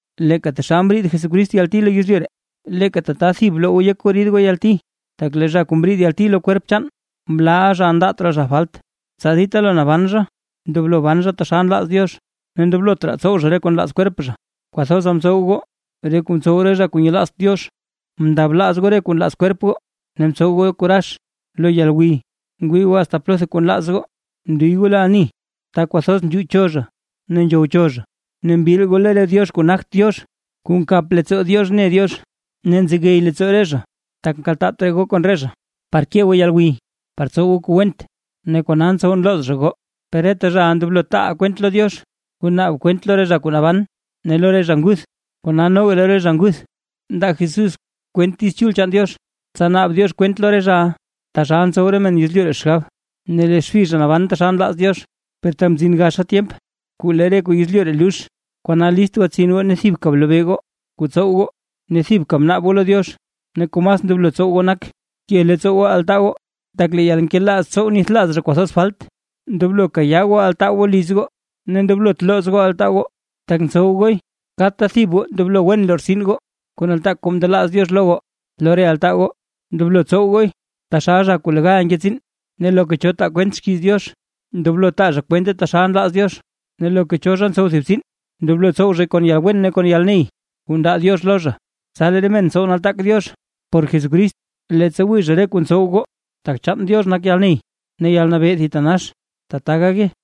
Leeka taxal mriid Jesucrist yalti lo yezlyu ree, leeka tata thib bloo goo yek goo rid goo yalti; tak lee zha kuu mriid yalti lo kwerp chaan, mlaaʼa zha ndaat raa zha falt, tsa dita lo naban zha ndoblo ban zha taxal nlaaz Diox, ne ndoblot raa tsow zha re kuu nlaaz kwerp zha. Kwathoza mtsow goo re kuu ntsow re zha kuu nyelaazt Diox, mndablaaz goo re kuu nlaaz kwerp goo ne mtsow goo kuu narax, lo yalgwiy, ngwii goo asta plotha kuu nlaaz goo, mndiy goo lo ani ta kwathoz nzhuucho zha ne nzhowcho zha, ne mbil goo lo re diox kuu nagt Diox kuu nkap leettsoo Diox ne Diox. Ne nzegey leettsoo re zha, tak nkaltaat raa goo kon re zha par ke goo yalgwiy par tsow goo kuu went, ne kona ntsow nlooz zha goo. Per reta zhaʼa ndoblo taa kwent lo Diox, kuu naab kwent lo re zha kuu naban ne lo re zha nguth. Kona noga lo re zha nguth mndaa Jesús kwent Diiz Chul chaan Diox, tsa naab Diox kwent lo re zhaʼa taxal ntsow re men yezlyu ree xgab, ne lee xbi zha naban taxal nlaaz Diox. Per tak mzin gaxa tyemp kuu lee re kuu yezlyu ree lux. Kona list gwatsin goo ne thibka blobee goo kuu tsow goo ne thibka bnaab goo lo Diox. Ne kuu mas ndoblo tsow goo nak; ke leettsoo goo altaa goo, tak lee yalnkelaaz ntsow nithlaaz zha kwathoz falt. Ndoblo kayaa altaa goo goo liz goo, ne ndoblot looz goo altaa goo tak ntsow gooy. Kadta thib goo ndoblo wen lortsin goo, kuu nataak kuu mndelaaz Diox lo goo lo re altaa goo, ndoblo tsow gooy taxal zha kuu legal nke tsiin. Ne loka cho taa kwent xkiiz Diox, ndoblo taa zha kwente taxal nlaaz Diox; ne loka cho zha ntsow thib tsiin, ndoblo tsow zhay kon yalwen ne kon yalney kuu ndaa Diox lo zha. Tsa lee re men tsow nataak Diox por Jesucrist, leettsa wii zha re kuu ntsow goo, tak chaan Diox nak yalney ne yalnabee thitanax. Tata gake.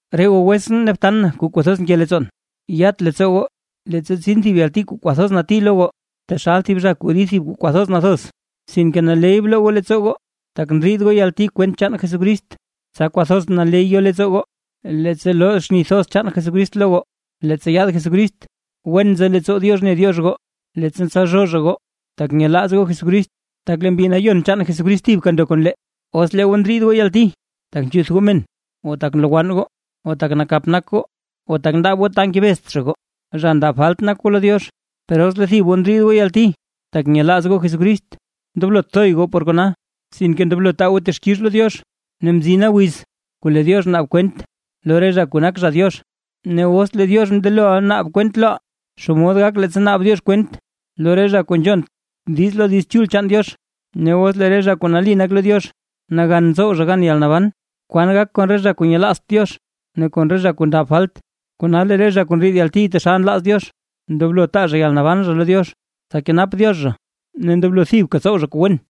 Re goo wetsʼn ne btan na kuu kwathoz nke leettsoon. Yat leettsoo goo, leettsa tsin thib yalti kuu kwathoz nati lo goo, taxal thib zha kuu rid thib kuu kwathoz nathoz. Sinke naley bloo goo leettsoo goo, tak ndriid goo yalti kwent chaan Jesucrist, tsa kwathoz naley yo leettsoo goo, leettsa loo xni thoz chaan Jesucrist lo goo leettsa yaad Jesucrist. Wen nzo leettsoo Diox ne Diox goo, leettsa ntsalzhoo zha goo, tak nyelaaz goo Jesucrist, tak lee Mbi Nayon chaan Jesucrist thibka ndo kon lee. Os lee goo ndriid goo yalti, tak nzhuth goo men, o tak nlowann goo, o tak nakap nak goo o tak ndaab goo ta ngebezt zha goo, zha ndab falt nak goo lo Diox. Per os lee thib goo ndriid goo yalti tak nyelaaz goo Jesucrist, ndoblot thoy goo por kona, sinke ndoblo taa goo texkix lo Diox. Ne mzina wiz kuu lee Diox naab kwent lo re zha kuu nak zha Diox. Ne os lee Diox mndeloʼa naab kwent loʼaa, ¿xomod gak leettsa naab Diox kwent lo re zha kuu nzhont diiz lo Diiz Chul chaan Diox? Ne os lee re zha kuu nali nak lo Diox, nagan tsow zha gan yalnaban, ¿kwan gak kon re zha kuu nyelaazt Diox ne kon re zha kuu ndab falt? Kona lee re zha kuu ndriid yalti taxal nlaaz Diox, ndoblo taa zha yalnaban zha lo Diox tsa kenap Diox zha, ne ndoblo thibka tsow zha kuu wen.